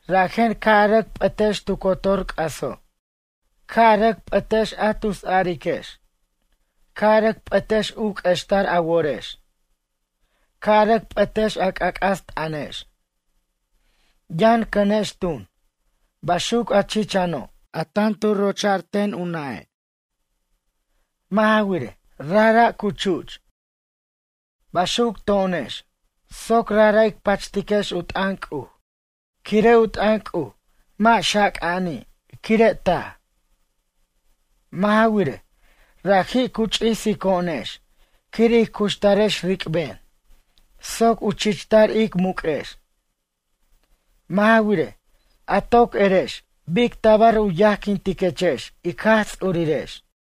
Rajen ca' a rʌc p'ʌtex tu cotor c'aso'. Ca' a rʌc p'ʌtex a tusariquex. Ca' a rʌc p'ʌtex u q'uextar a worex. Ca' a rʌc p'ʌtex a c'ac'as t'ʌnex. Yʌn cʌnex tun, baxuc a chichano' a tan tu rocha'r ten u nʌ'e'. Mʌ' ja wirej, rajra' cu chu'ch. Baxuc to'onex, soc rajra' ic pachtiquex u t'ʌn C'uj. Quire' u t'ʌn C'uj mʌ' xaca'ani' quire' taj. Mʌ' ja wirej, raji' cu ch'isico'onex quir ij cuxtarex ric'ben soc u chichtar ic muq'uex. Mʌ' ja wirej, a toc erex bic tabar u yajquintiquechex ic Jaj Ts'urirex.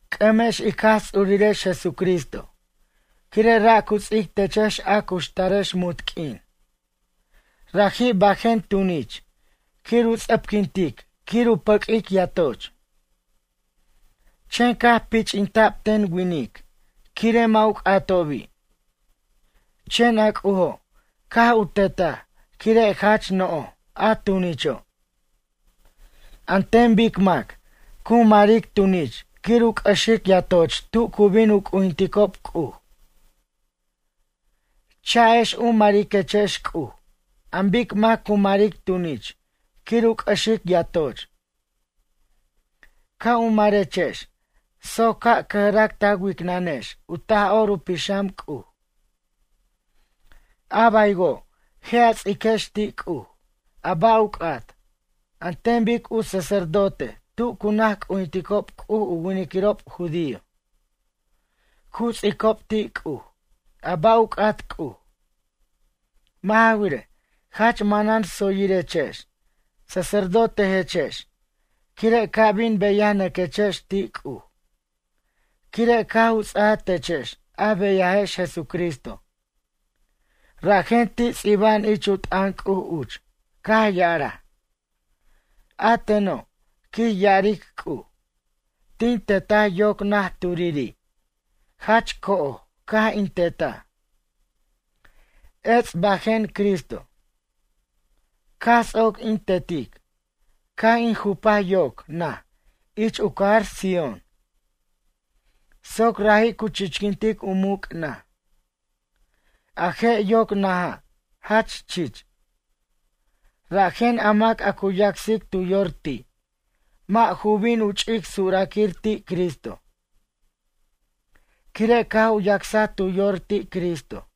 C'ʌmex ic Jaj Ts'urirex Jesucristo quire' ra' cu ts'ic techex a cuxtarex munt q'uin. Raji' bajen tunich quir u ts'ʌpquintic quir u pʌq'uic yatoch. Chen caj pich'inta'b ten winic quire' mʌ' u c'atobi'. Chen a C'ujo', caj u tetaj quire' jach no'j, a tunicho'. An ten bic mac, cu maric tunich quir u c'ʌxic yatoch tu cu bin u c'ujinticob C'uj. Cha'ex u mariquechex C'uj an bic mac cu maric tunich quir u c'ʌxic yatoch. Ca' u marechex soc ca' cʌjrac ta wicnanex u Taj'or u Pixam C'uj. A baywo', je' a ts'iquex ti' C'uj, a ba' u c'at, an ten bic u sacerdote tu cu naj c'ujinticob C'uj u winiquirob judío cu ts'icob ti' C'uj a ba' u c'at C'uj. Mʌ' ja wirej, jach manan tsoyirechex sacerdotejechex quire' ca' bin beyanʌquechex ti' C'uj quire' caj u ts'aja techex a beyajex Jesucristo. Rajen, ti' ts'iba'an ich u t'ʌn C'uj uch caj ya'araj: A teno', quij ya'aric C'uj, tin tetaj yoc naj turiri'. Jach co'oj caj in tetaj. Ets' bajen Cristo. Caj ts'oc in tetic, caj in jupaj yoc naj ich u cajar Sión. Soc raji' cu chichquintic u muc' naj. A je' yoc naja', jach chich. Rajen a mac a cu yacsic tu yor ti', mʌ' ju bin u ch'ic suraquir ti' Cristo. Quire' caj u yacsaj tu yor ti' Cristo.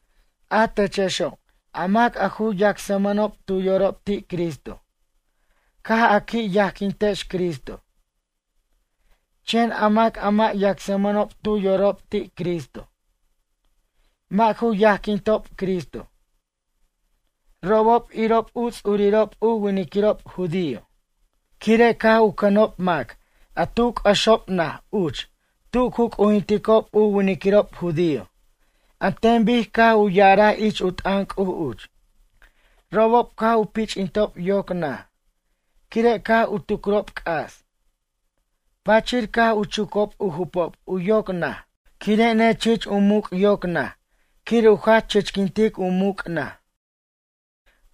A techexo' a mac a ju yacsmʌnob tu yorob ti' Cristo. Caj a qui' yajquintex Cristo. Chen a mac a mʌ' yacsmʌnob tu yorob ti' Cristo. Mʌ' ju yajquintob Cristo. Robob irob u ts'urirob u winiquirob judío quire' caj u cʌnob mac a tu c'ʌxob naj uch tu cu c'ujinticob u winiquirob judío an ten bic caj u ya'arar ich u t'ʌn C'uj uch. Robob caj u pich'intob yoc naj quire' caj u tucrob c'as. Pachir, caj u chucob u jupob u yoc naj quire' nechich u muc' yoc naj quir u jach chichquintic u muc' naj.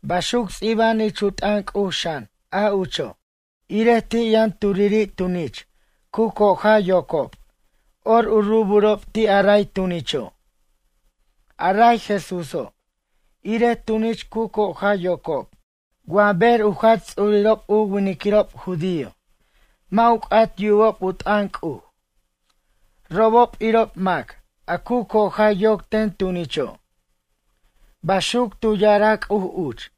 Baxuc ts'iba'an ich u t'ʌn C'uj xan a ucho': Irej ti' yʌn turiri' tunich cu coja yocob, or u ruburob ti' a ray tunicho'. A ray Jesúso', irej tunich cu coja yocob, wa ber u jach ts'urirob u winiquirob judío mʌ' u c'at yubob u t'ʌn C'uj robob irob mac a cu coja yoc ten tunicho'. Baxuc tu ya'araj C'uj uch.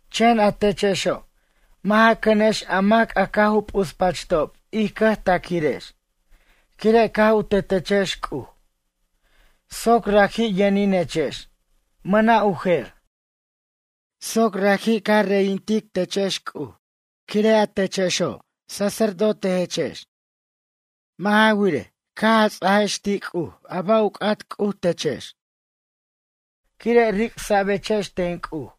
Chen a techexo' mʌ' ja cʌnex a mac a caj u p'uspachtob ij cʌj taquirex quire' caj u tetechex C'uj, soc raji' yʌninechex, mʌna' u jer. Soc raji' ca reyintiqutechex C'uj quire' a techexo', sacerdotejechex. Mʌ' ja wirej, caj a ts'iquex ti' C'uj a ba' u c'at C'uj techex. Quire' ric'sa'bechex ten C'uj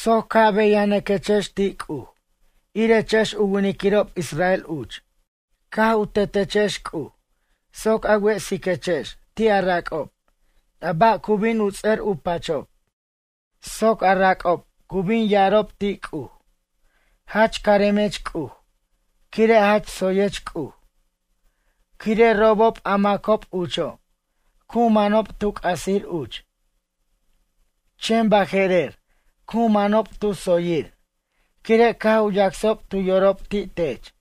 soc ca' beyanʌquechex ti' C'uj irechex u winiquirob israel uch. Caj u tetechex C'uj soc a wesiquechex ti' a rac'ob a ba' cu bin u ts'ʌr u pachob. Soc a rac'ob cu bin ya'arob ti' C'uj: “Jach caremech C'uj quire' jach tsoyech C'uj. Quire' robob a macob ucho' cu manob tu c'asir uch. Chen baje'rer cu manob tu tsoyir quire' caj u yacsob tu yorob ti' tech.”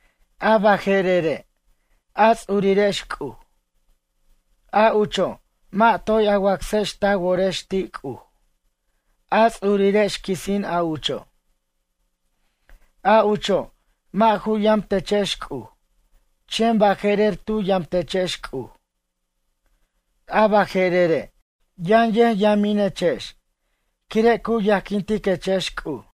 A baje'rere', a ts'urirex C'uj. A ucho', mʌ' toy a wacsex ta worex ti' C'uj, a ts'urirex quisin a ucho'. A ucho' mʌ' ju yamtechex C'uj, chen baje'rer tu yamtechex C'uj. A baje'rere', yʌn yʌjyaminechex quire' cu yajquintiquechex C'uj.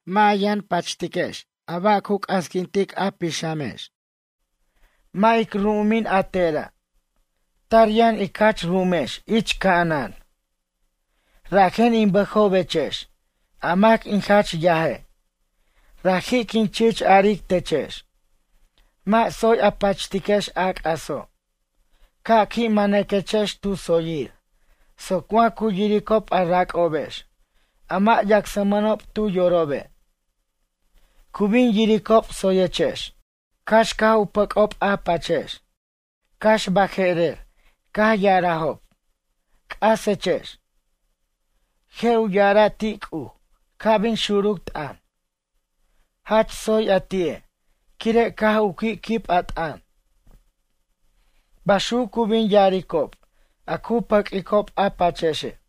Mʌ' a yʌn pachtiquex ba' cu c'asquintic a pixamex. Mʌ' ic ru'umin a tera'. Tar yʌn ic jach ru'umex ich ca'anan. Rajen in bʌjobechex a mac in jach yaje'. Raji' quin chich aric techex: “Mʌ' tsoy a pachtiquex a c'aso'.” Ca' qui' manʌquechex tu tsoyir soc wa cu yiricob a rac'obex a mʌ' yacsmʌnob tu yorobe'. Cu bin yiricob tsoyechex, cax caj u pac'ob a pachex. Cax baje'rer caj ya'arajob: “C'asechex.” Je' u ya'ara' ti' C'uj ca' bin xuruc t'ʌn: “Jach tsoy a ti'e', quire' caj u qui' quib a t'ʌn.” Baxuc cu bin ya'aricob a cu pʌq'uicob a pachexe'.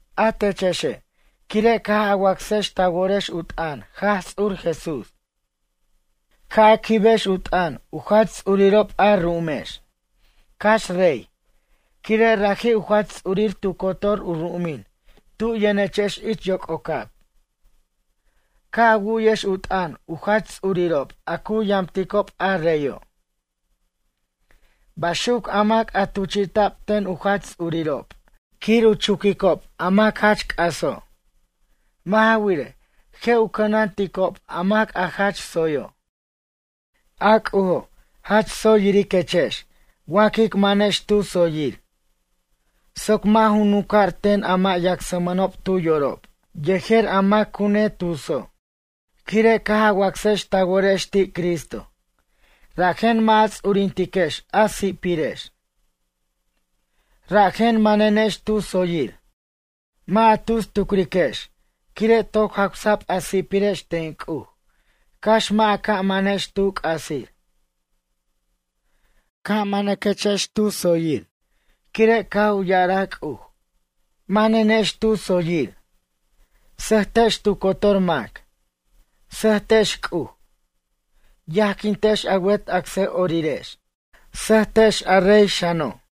A techexe' quire' caj a wacsex ta worex u t'ʌn Jaj Ts'ur Jesús. Ca' a quibex u t'ʌn u jach ts'urirob a ru'umex. Cax rey, quire' raji' u jach ts'urir tu cotor u ru'umin tu yʌnechex ich yoc'ocab. Ca' a wu'yex u t'ʌn u jach ts'urirob a cu yamticob a reyo'. Baxuc a mac a tuchi'ta'b ten u jach ts'urirob quir u chuquicob a mac jach c'aso'. Mʌ' ja wirej, je' u cʌnanticob a mac jach tsoyo'. A C'ujo' jach tsoy yiriquechex wa quic manex tu tsoyir. Soc mʌ' ju nunca'r ten a mʌ' yacsmʌnob tu yorob yejer a mac cu netuso'. Quire' caj a wacsex ta worex ti' Cristo, rajen mʌ' a ts'urintiquex a si'pirex. Rajen manenex tu tsoyir. Mʌ' a tus tucriquex quire' toc jawsa'b a si'pirex ten C'uj cax mʌ' a ca' manex tu c'asir. Ca' manaquechex tu tsoyir quire' caj u ya'araj C'uj: “Manenex tu tsoyir.” Sʌjtex tu cotor mac. Sʌjtex C'uj. Yajquintex a wet acsʌ'orirex. Sʌjtex a rey xano'.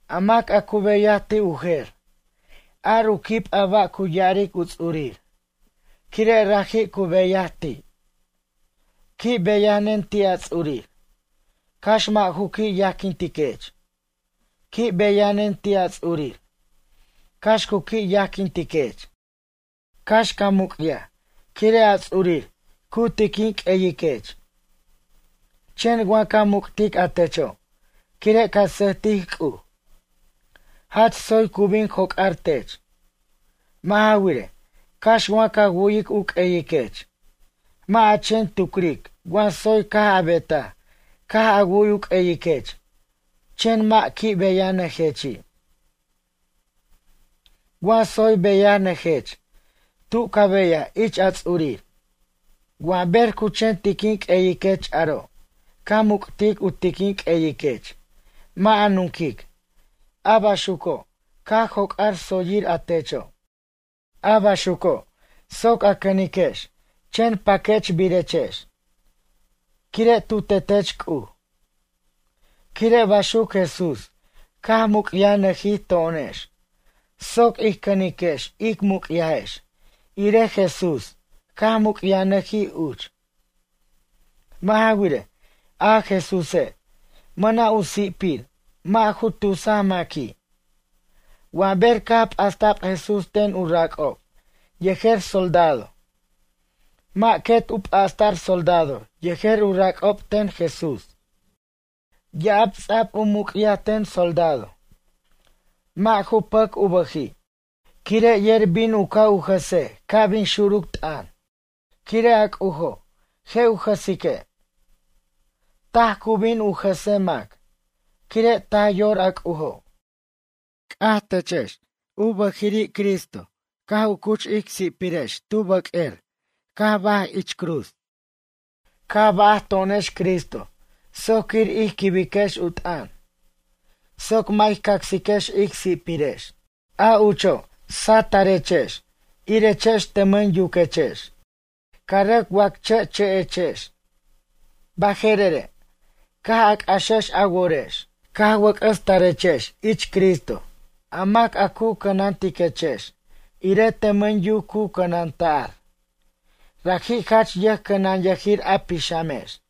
A mac a cu beyaj ti' u jer, ar u quib a ba' cu ya'aric u ts'urir, quire' raji' cu beyaj ti'. Qui' beyanen ti' a ts'urir, cax mʌ' ju qui' yajquintiquech. Qui' beyanen ti' a ts'urir, cax cu qui' yajquintiquech. Cax ca muc'yaj quire' a ts'urir cu tiquin q'ueyiquech. Chen wa ca muc'tic a techo', quire' ca sʌjtic C'uj. Jach tsoy cu bin joc'ar tech. Mʌ' ja wirej, cax wa ca wu'yic u q'ueyiquech. Mʌ' a chen tucric wa tsoy caj a betaj caj a wu'y u q'ueyiquech chen mʌ' qui' beyanʌjechi'. Wa tsoy beyanʌjech tu ca beyaj ich a ts'urir. Wa ber cu chen tiquin q'ueyiquech aro' ca muc'tic u tiquin q'ueyiquech mʌ' a nunquic, a baxuco' ca joc'ar tsoyir a techo'. A baxuco' soc a cʌniquex chen paquechbirechex. Quire' tu tetech C'uj. Quire' baxuc Jesús caj muc'yajnʌjij to'onex soc ij cʌniquex ic muc'yajex irej Jesús caj muc'yajnʌjij uch. Mʌ' ja wirej, a Jesúse' mʌna' u si'pir mʌ' ju tusaj maqui'. Wa ber caj p'asta'b Jesús ten u rac'ob yejer soldado. Mʌ' quet u p'asta'r soldado yejer u rac'ob ten Jesús. Ya'ab ts'a'b u muc'yaj ten soldado. Mʌ' ju pʌc u bʌji', quire' yer bin u ca' u jasej ca' bin xuruc t'ʌn. Quire' a C'ujo', je' u jʌsique'. Taj cu bin jʌse mac, quire' taj yor a C'ujo'. C'aj techex u bʌjiri' Cristo caj cuch ic si'pirex tu bʌq'uer caj baj ich cruz. Caj baj to'onex Cristo soc quir ij quibiquex u t'ʌn. Soc mʌ' ij cacsiquex ic si'pirex. A ucho' satʌrechex irechex tʌmʌn yuquechex, ca rʌc wacche'chʌ'echex. Baje'rere' caj a c'axex a worex caj wʌc'ʌs tarechex ich Cristo, a mac a cu cʌnantiquechex irej tʌmʌn yuc cu cʌnanta'r. Raji' jach yʌjcʌnanyʌjir a pixamex.